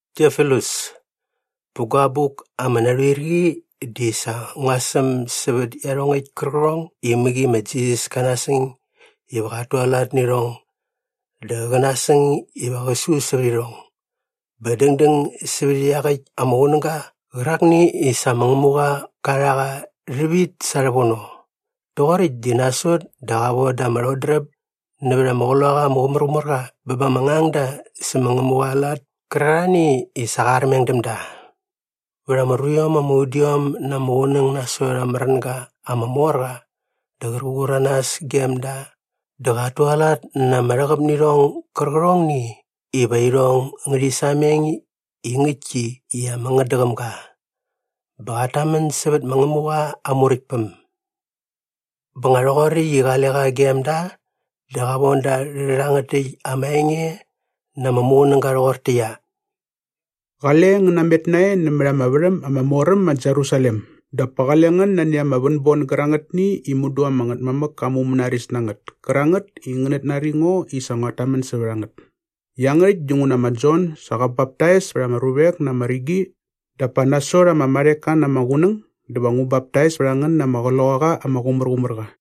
Tiofilus, pä gua abuk ama narhuir qi di sa ngua säm sävät iarhongäkt kärqärhong i mäqi ma Jisas ka nasäng iva qat tualat nä irhong dä qä nasäng iva qä su sävät irhong bä dängdäng sävät iaqäkt ama qunäga qärakni i sa ma Ngämuqa qa rha qa rhävit sa rhävono. Rhoqoräkt di nasot dä qa voda ama rhodräp nävät ama Qloqaqa ama Qumärqumärqa bä ba ama ngangda sä ma Ngämuqa aa lat kärarhani i sa qa armeng däm da. Vät ama ruiom ama udiom na ama qunäng nasot aa märänga ama mor qa dä qär qur a nas gem da dä qat tualat na ama rhäqäp nä irhong gärqärhongni iva irhong ngärhi sameng i ngäktki i ama ngätdäqäm ga. Bä qat tamän sävät ma Ngämuqa aa Muräktpäm. Bä nga rhoqoräkt i qale qa gem da dä qa von da rhä rhangät täkt ama enge na ama muqunäga rhoqortäqyia, “Qale ngän namet nae nämät ama värhäm ama mor äm ma Jerusalem dap pa qale ngän nani ama vänbon gärangätni i mudu ama Ngätmamäk ka mumänaris na ngät kärangät i ngänät nari ngo i sa nguat tamän sävät a ngät. Iangärhäkt dinguna ma Jon sa qä baptais pät ama ruvek na ama rigi dap pa nasot ama marheka na ama qunäng dä va ngu baptais pät a ngän na ama Qloqaqa ama Qumärqumärqa.”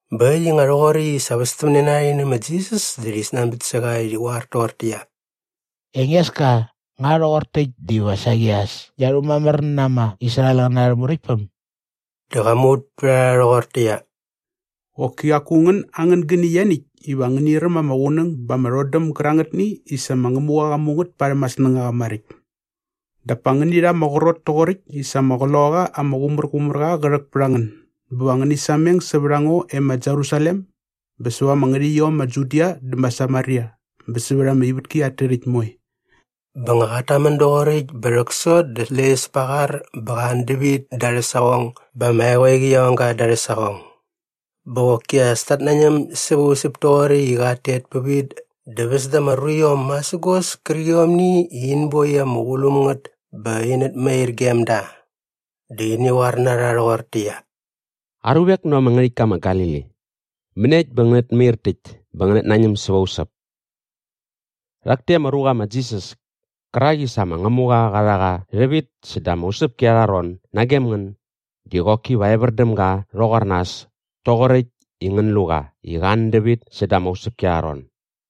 Bä äkt i nga rhoqoräkt i sa västämne na rha rhi nä ma Jisas dä rhi snanbät sä qa i rhi qoar toqortäqyia, “Engeska, nga rhoqor täkt diva saqi as ngia rhumamär na ama Israelqäna arhä muräktpäm?” Dä qa muvät pät a rha rhoqortäqyia, “Qoki qaku ngän angän gäni ianiäkt iva ngäni räm ama qunäng bä ama rhodäm gärangätni i sa ma Ngämuqa qa mu ngät parhäm aa snängaqa maräkt. Dap pa ngäni rha ama qrot toqoräkt i sa ama Qloqaqa ama Qumärqumärqa qä rhäk pät a ngän bä va ngäni sameng sävät a ngo e ma Jerusalem bä säva ama ngärhäqyiom ma Judia dä ma Samaria bä sävät ama ivätki at tärhäkt moe.” Bä nga qat tamän doqoräkt bä rhäksot dä släqyäs pa aa qar bä qa an dävit da arhä saqong bä ama eqoeqi qia ong ga da arhä saqong. Bä qoki as tat nañäm säva usäp toqoräkt i qat tet pävit dä väs da ama ruiom masägos kärqiomni i in boi ama qulum ngät bä inät mair gem da. Dä ini qoar na rha rhoqortäqyia, “Aruvek näva ama ngärhäktka ma Galili, mäniekt bä ngänät mair täkt bä ngänät nañäm säva usäp? Rhak täkt ama ruqa ma Jisas kärak i sa ma Ngämuqa qa rha qa rhävit säda ama usäpki arha ron nagem ngän di qoki va evär däm ga rhoqor nas toqoräkt i ngän lu qa i qa an dävit säda ama usäpki arha ron.”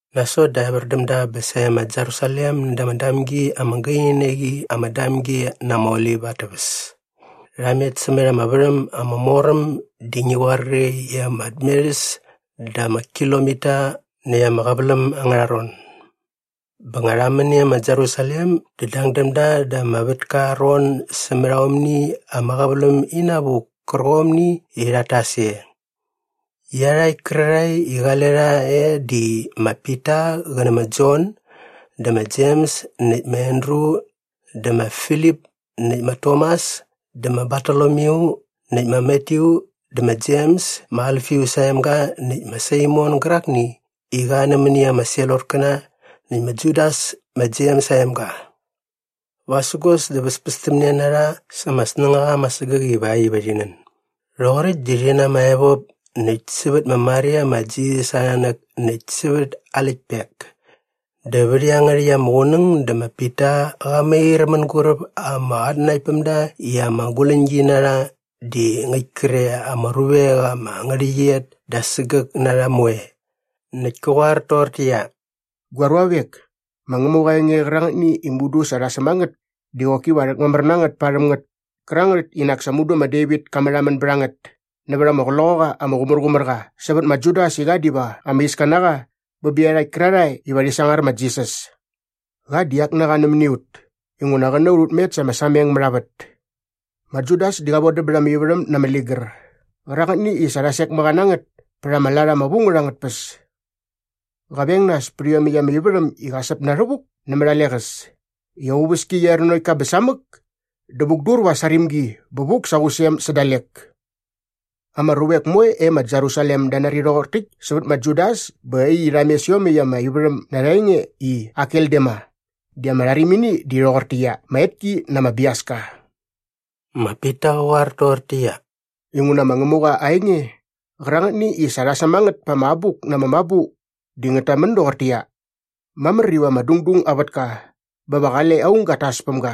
Nasot dä evär däm da bä sae ma Jerusalem näda ama damgi ama gaini na qi ama Damgi na ama Olip at täväs. Rha met sämät ama värhäm ama mor äm di ngi qoar qre i ama tmerhäs da ama kilomita näkt ama qäväläm angärha ron. Bä nga rha män e ma Jerusalem dä dang däm da da ama vätka aa ron sämät aomni ama qäväläm inavuk kärqomni i rhat tas e. Iarhakt kärarhae i qale rha e di ma Pita qä nä ma Jon dä ma Jems näkt ma Andru dä ma Filip näkt ma Tomas dä ma Bartolomyu näkt ma Matyu dä ma Jems ma Alfius aa emga näkt ma Saimon gärakni i qa nämäni ama Selotkäna näkt ma Judas ma Jems aa emga. Vasägos dä väspästämne na rha sa ama snängaqa ama sägäk ivakt iva rhi nän. Rhoqoräkt di rhi na ama evop näkt sävät ma Maria ma Jisas aa nanäk näkt sävät aa läktpek. Dä vät iangärhäkt ama qunäng dä ma Pita qa mair mänguräp ama qatnanaktpämda i ama guläñgi na rha di ngäkt kre ama ruvek ama ngärhäqyet da sägäk na rha moe. Näkt kä qoar toqortäqyia, “Gua ruavek, ma Ngämuqa aa enge qärangätni i mudu sa rha säm a ngät di qoki va rhäkmamär na ngät parhäm ngät kärangät i nak sa mudu ma Devit ka märhamän bät a ngät nävät ama Qloqaqa ama Qumärqumärqa sävät ma Judas i qa diva ama iska na qa bä bä iarhakt kärarhae iva rhi sangar ma Jisas. Qa di ak na qa nämäni ut inguna qä na ut ut met sa ama sameng mät a vät. Ma Judas di qa vodäm bät ama ivärhäm na ama ligär qärangätni i sa rha sek mä qa na ngät pät aa lat ama vu ngät angät tpäs. Qa veng nas pät iomäkt ama ivärhäm i qa säp na rhävuk nämät a leqäs i aa uväski qia er nanokt ka bä samäk dä vukdur va aa sarimgi bä vuk sa aa qusem sä dalek. Ama ruvek moe e ma Jerusalem da nari rhoqor täkt sävät ma Judas bä äkt i rha mes iomäkt ama ivärhäm na arha enge i Akeldama di ama rharimini di rhoqortäqyia, ma Etki na ama Biaska.” Ma Pita qä qoar toqortäqyia, “Inguna ma Ngämuqa aa enge qärangätni i sa rha säm a ngät pa ama Abuk na ama Mabu di ngät tamän doqortäqyia, “‘Mamär iva ama dungdung aa vätka bä va qale aung gat tas päm ga.’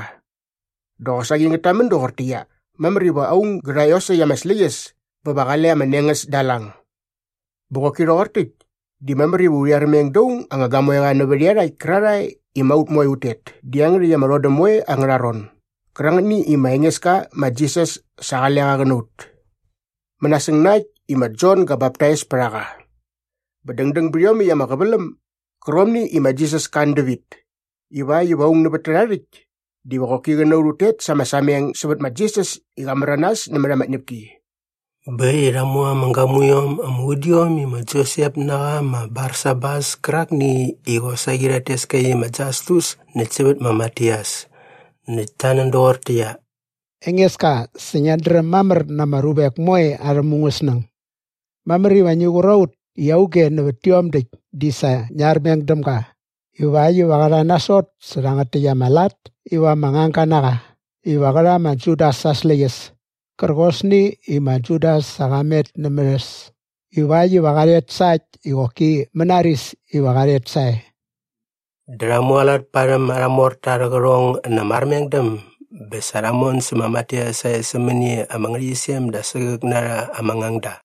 Dä qosaqi ngät tamän doqortäqyia, “‘Mamär iva aung gä rha iosäkt aa släqyäs bä va qale ama nengäs da aa lang.’ Bä qoki rhoqor täkt di mamär iva urhi armeng da aung anga gamoeqa nävät iarhakt kärarhae i ma ut moe ut tet dä iangärhäkt ama rhodäm moe angärha ron gärangätni i ma Engeska ma Jisas sa qale qa qä na ut mänasäng na äkt i ma Jon ga baptais pät a qa bä dängdäng bät iomäkt ama qäväläm gärqomni i ma Jisas ka an dävit ivakt iva aung nävät tärha rhäkt diva qoki qä na ut ut tet sa ama sameng sävät ma Jisas i qa märanas nämät ama tñäpki.” Bä äkt i rha mu ama gamuiom ama udiom i ma Josep na qa ma Barsabas kärakni i qosaqi rhat tes ka i ma Jastus näkt sävät ma Matias. Näkt ta nän doqortäqyia, “Engeska, sa ngiat dräm mamär na ama ruvek moe arhä mungäsnäng. Mamär iva ngi qur a ut i auge nävät tiom däkt di sa ngia armeng däm ga ivakt iva qä rha nasot sä rhangät täkt ama lat iva ama ngangga na qa iva qä rha ma Judas aa släqyäs kärqosni i ma Judas sa qa met nämät äs ivakt iva qa rhet sa äkt i qoki mänaris iva qa rhet sae.” Dä rha mualat parhäm arha morta arhä qärhong na ama armengdäm bä sa rha mon sä ma Matias sae sämäni ama ngärhäqyisem da sägäk na rha ama ngangda.